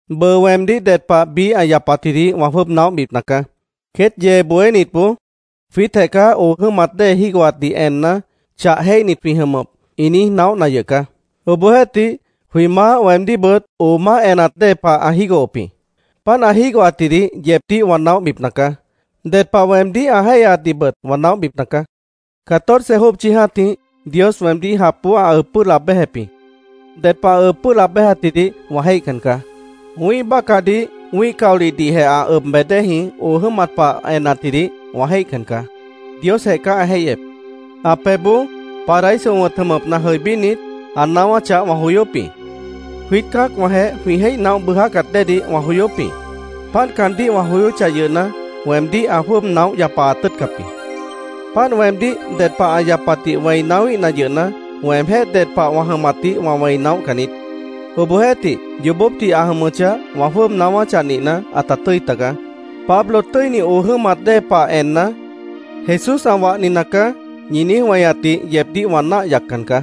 Bʉʉ weemdíh ded pah biíh ã yapatjidih wã jwʉ́ʉb naóhbipna caá. Queét yee bohénitboó “Jwiítjeh caá oo jʉ́mat dée jígohatdih enna, chah jéihnit jwĩ jʉmʉp”, ĩ niíj naóhna yʉh caá. Obohjeéhtih, jwĩ Maáh weemdíhbʉt oo máh enat dée pah ã jígohop jĩ. Páant ã jígohatjidih yeebdíh wã naóhbipna caá. Ded pah weemdíh ã jéihyaatdihbʉt wã naóhbipna caá. Catorce jópchi jã́tih Dios weemdíh japboó ã ʉb pʉ́ʉh laab béjep jĩ. Ded pah ã ʉb pʉ́ʉh laab béjatjidih wã jéihcan caá. Wĩ́ih bácahdih, wĩ́ih caolihdihjeh ã ʉb bej déeji oo jʉ́mat pah enatjidih, wã jéihcan caá. Diosjeh caá ã jéihyep. Ã pebhboó, Paraíso wʉ̃t jʉmʉpna jʉibínit, ã naáwáchah wã joyóp jĩ. Jwiít cã́acwãjeh jwĩ jéih naóh bʉʉjácat déedih wã joyóp jĩ. Páant caandíh wã joyóchah yʉhna, weemdíh ã jwʉ́ʉb naóh yapaat tʉ́ʉtcap jĩ. Páant weemdíh ded pah ã yapatdih wẽi naáwíhna yʉhna, weemjéh ded pah wã jʉmatdih wã wẽi naóhcan niít. Obohjeéhtih, yoobópdih ã jʉmʉchah, wã jwʉ́ʉb naáwáchah nihna, ãta tʉ́i taga. “Pablo tʉ́ini oo jʉ́mat dée pah enna, Jesús ã wahni nacaá”, ñi niíj weñatdih yeebdíh wã náah yaccan caá.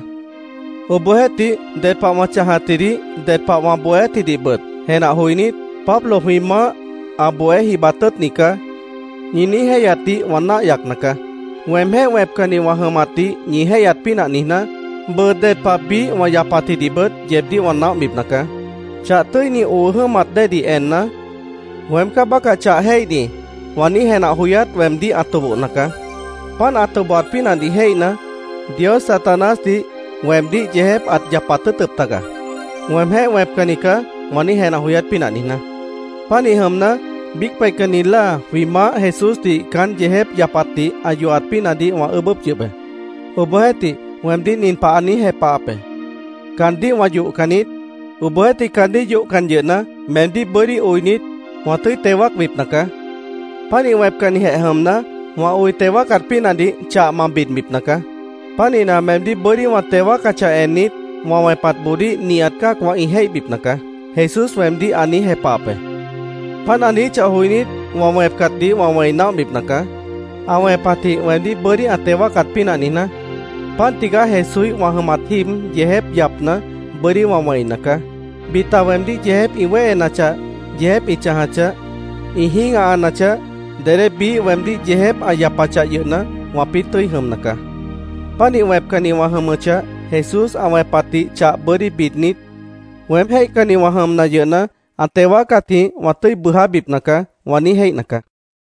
Obohjeéhtih, ded pah wã chãjatjidih, ded pah wã bohéátjidihbʉt jenah joinít, “Pablo jwĩ Maáh ã bohé jibat tʉ́ʉtni caá”, ñi niíj jéihyatdih wã náah yacna caá. Weemjéh wẽpcanni wã jʉmatdih ñi jéihyat pínah niijná, bʉʉ ded pah biíh wã yapatjidihbʉt yeebdíh wã naóhbipna caá. Chah tʉ́ini oo jʉ́mat déedih enna, “Weém caá bácah chah jéihni”, wã niíj jenah joyát weemdíh ã tobohna caá. Páant ã tobohat pínahdih jéihna, Dios Satanásdih weemdíh yeejép ãt yapat tʉ́ʉtʉp taga, “Weemjéh wẽpcanni caá”, wã niíj jenah joyát pínah niijná. Pánih jʉmna, biíc peihcanni láa jwĩ Maáh Jesúsdih caán yeejép yapatdih ã yohat pínahdih wã ʉʉ́bʉ́p yʉh be. Obohjeéhtih, weemdíh nin pah ã niíj jepahap be: “Caandíh wã yohcan niít. Obohjeéhtih, caandíh yohcan yʉhna, meemdíh bʉ́dí oinit, wã tʉ́i teo wáacbipna caá. Pánih wẽpcannijeh jʉmna, wã oi teo wáacat pínahdih chah ma bidbipna caá. Pánihna, meemdíh bʉ́dí wã teo wáacachah ennit, wã wẽpatboodíh nihat cã́acwã ĩ jéihbipna caá”, Jesús weemdíh ã niíj jepahap be. Páant ã niijíchah joinít, wã wẽpcatdih wã wẽi naóhbipna caá, ã wẽpatjĩh weemdíh bʉ́dí ã teo wáacat pínah niijná. Páant tigaá Jesúíh wã jʉmat jíib yeejép yapna, bʉ́dí wã wẽina caá. Bita weemdíh yeejép ĩ wéhenachah, yeejép ĩ chãjachah, ĩ jĩ́gahanachah, dedé biíh weemdíh yeejép ã yapachah yʉhna, wãpĩ́ tʉ́i jʉmna caá. Pánih wẽpcanni wã jʉmʉchah, Jesús ã wẽpatdih chah bʉ́dí bidnit, “Weém jéihcanni wã jʉmna yʉhna, ã teo wáacatjĩh wã tʉ́i bʉʉjábipna caá”, wã niíj jéihna caá.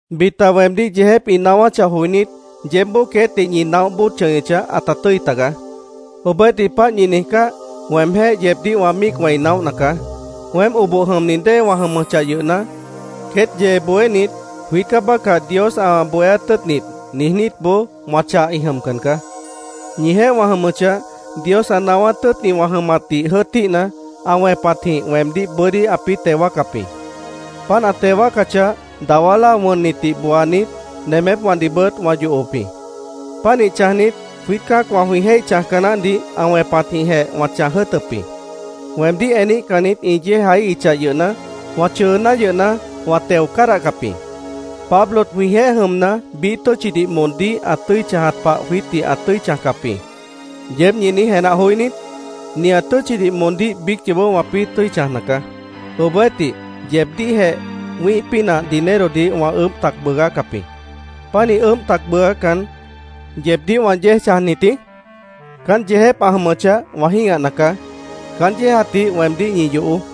Bita weemdíh yeejép ĩ naáwáchah joinít, yeébboó queétdih ñi naóh bóod chʉñʉchah, ãta tʉ́i tagaá. Obohjeéhtih, páant ñi niijcáh, weemjéh yeebdíh wã míic wẽi naóhna caá. Weém oboh jʉmni dée wã jʉmʉchah yʉhna, queét yee bohénit “Jwiít caá bácah Dios ã bohéát tʉ́ʉtnit”, niijnítboó wã chah ĩ jʉmcan caá. Ñijeéh wã jʉmʉchah, Dios ã naáwát tʉ́ʉtni wã jʉmatdih jʉ́ʉtíhna, ã wẽpatjĩh weemdíh bʉ́dí ãpĩ́ teo wáacap jĩ. Páant ã teo wáacachah, dawá láa wʉnnitdih booanit, nemépwãdihbʉt wã yohop jĩ. Pánih chãjnit, jwiít cã́acwã jwĩ jéih chãjca naáhdih ã wẽpatjĩhjeh wã chãj jʉ́ʉtʉp jĩ. Weemdíh eníhcannit ĩ yéejaíhichah yʉhna, wã chʉʉná yʉhna, wã teo cádahcap jĩ. “Pablo jwĩjeéh jʉmna, biíh tʉ́tchidih moondíh ã tʉ́i chãjat pah jwiítdih ã tʉ́i chãjcap jĩ”, ¿yeéb ñi niíj jenah joí niít? Nihat tʉ́tchidih moondíh biíc yoobó wãpĩ́ tʉ́i chãjna caá. Obohjeéhtih, yeebdíhjeh wĩ́ih pínah dinerodih wã ʉʉ́bh tac bʉʉgácap jĩ. ¿Pánih ʉʉ́bh tac bʉʉgácan, yeebdíh wã yéej chãjnit jĩí? Caán yeejép ã jʉmʉchah, wã jĩ́gahna caá. Caán yéejatdih weemdíh ñi yohoó.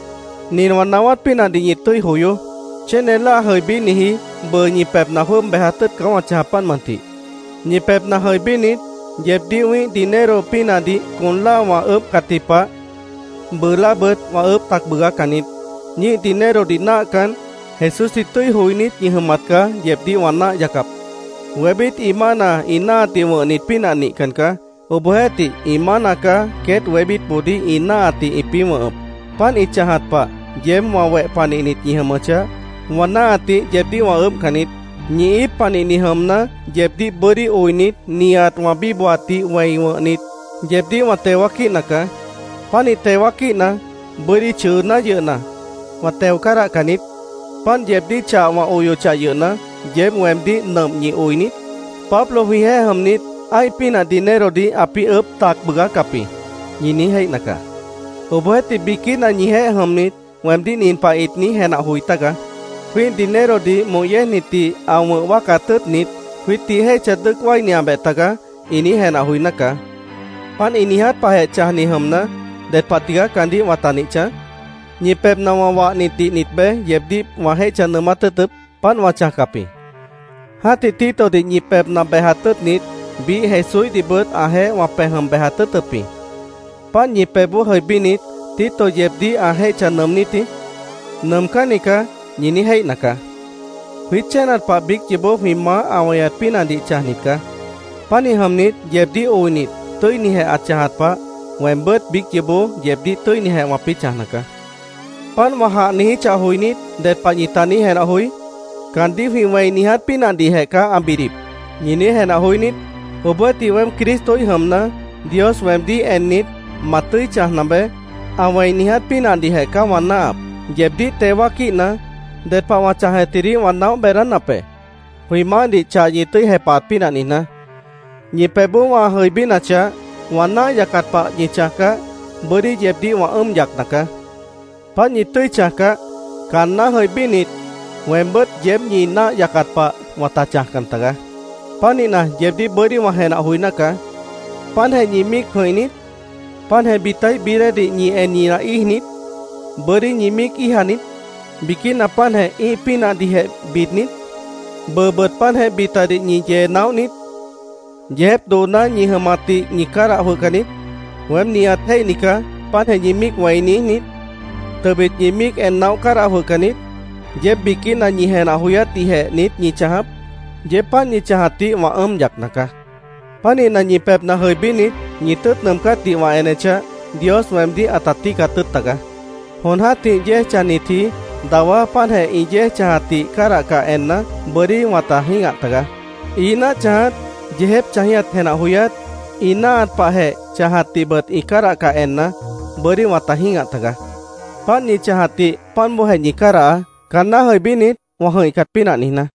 Nin wã naáwát pínahdih ñi tʉ́i joyoó: Chéne láa jʉibíniji bʉʉ ñi pebhna jwʉ́ʉb bejat tʉ́ʉt caá wã chãjap, páant mʉntih. Ñi pebhna jʉibínit, yeebdíh wĩ́ih dinero pínahdih con láa wã ʉʉ́bhcatji pah, bʉʉ láabʉt wã ʉʉ́bh tac bʉʉgácan niít. Ñíih dinerodih náahcan, Jesúsdih tʉ́i joinít ñi jʉmat caá yeebdíh wã náah yacap. Wébít ĩ mána ĩ náahatdih wʉ̃hnit pínah nihcan caá. Obohjeéhtih ĩ mána caá queét wébítboodíh ĩ náahatdih ĩpĩ́ wʉ̃hʉp. Páant ĩ chãjat pah yeéb wã weh panihnit ñi jʉmʉchah, wã náahatdih yeebdíh wã ʉʉ́bhcan niít. Ñi íip panihni jʉmna, yeebdíh bʉ́dí oinit, nihat wã bíbohatdih wẽi wʉ̃hnit, yeebdíh wã teo wáaquíhna caá. Pánih teo wáaquíhna, bʉ́dí chʉʉná yʉhna, wã teo cádahcan niít. Páant yeebdíh chah wã oyochah yʉhna, ¿yeéb weemdíh nʉmp ñi oi niít? “Pablo jwĩjeéh jʉmnit, ã́ih pínah dinerodih ãpĩ́ ʉʉ́bh tac bʉʉgácap jĩ”, ñi niíj jéihna caá. Obohjeéhtih, biquína ñijeéh jʉmnit weemdíh nin pah ĩt niíj jenah joi tágaá: “Jwĩ́ih dinerodih moh yéejnitdih ã wʉ̃h wáacat tʉ́ʉtnit, jwiítdih jéihcha dʉ́ʉc wáiniabeh tagaá”, ĩ niíj jenah joiná caá. Páant ĩ niiját pahjeh chãjni jʉmna, ¿ded pah tigaá caandíh wãta nih chãj? ¿Ñi pebhna wã wahnitdih nit beé yeebdíh wã jéihcha nʉʉmát tʉ́ʉtʉp? Páant wã chãjcap jĩ. Jã́tih Titodih ñi pebhna bejat tʉ́ʉtnit, biíh Jesúíhdihbʉt ãjeéh wã pej jʉm bejat tʉ́ʉtʉp jĩ. Páant ñi pebhboó jʉibínit, ¿Tito yeebdíh ã jéihcha nʉʉmnít jĩí? “Nʉʉmcánni caá”, ñi niíj jéihna caá. Jwiít chénat pah biíc yoobó jwĩ maáh ã weñat pínahdih chãjnit caá. Pánih jʉmnit, yeebdíh oinit, tʉ́inijeh ã chãjat pah, weembʉ́t biíc yoobó yeebdíh tʉ́inijeh wãpĩ́ chãjna caá. Páant wã jãh niijíchah joinít, ¿ded pah ñita niíj jenah joí? “Caandíh jwĩ wẽi niiját pínahdihjeh caá ã bidip”, ¿ñi niíj jenah joí niít? Obohjeéhtih, weém Cristoíh jʉmna, Dios weemdíh ennit, “Ma tʉ́i chãjna beé”, ã wẽi niiját pínahdihjeh caá wã náahap. Yeebdíh teo wáaquíhna, ded pah wã chãjatjidih wã naóh beedánap be, jwĩ Maáhdih chah ñi tʉ́i jepahat pínah niijná. Ñi pebhboó wã jʉibínachah, wã náah yacat pah ñi chãjcah, bʉ́dí yeebdíh wã ʉ́ʉm yacna caá. Páant ñi tʉ́i chãjcah, caanná jʉibínit, weembʉ́t yeéb ñi náah yacat pah wãta chãjcan tagaá. Pánihna, yeebdíh bʉ́dí wã jenah joiná caá. ¿Páantjeh ñi míic jʉ̃ih niít? ¿Páantjeh bitaíh bií déedih ñi en ñinah íij niít? ¿Bʉ́dí ñi míic íija niít? ¿Biquína páantjeh ĩ́ih pínahdihjeh bid niít? ¿Bʉʉbʉt páantjeh bitadih ñi yee naóh niít? ¿Yeejép dooná ñi jʉmatdih ñi cádah jwʉhcan niít? ¿“Weém nihat jéihni caá”, páantjeh ñi míic wẽi niíj niít? ¿Tʉbit ñi míic en naóh cádah jwʉhcan niít? ¿Yeéb biquína ñi jenah joyátdihjeh niít ñi chãjap? Yeéb páant ñi chãjatdih wã ʉ́ʉm yacna caá. Pánihna, ñi pebhna jʉibínit, ñi tʉ́ʉt nʉʉmcátdih wã enechah, Dios weemdíh ãta tíicat tʉ́ʉt tagaá. Jon jã́tih yéej chãjnitji dawá páantjeh ĩ yéej chãjatdih cádahcah enna, bʉ́dí wãta jĩ́gah taga. Ií náah chãjat, yeejép chãjíhat jenah joyát, ĩ náahat pahjeh chãjatdihbʉt ĩ cádahcah enna, bʉ́dí wãta jĩ́gah taga. Páant ñi chãjatdih páant bóojeh ñi cádahaá, caanná jʉibínit, wã jʉ̃ihcat pínah niijná.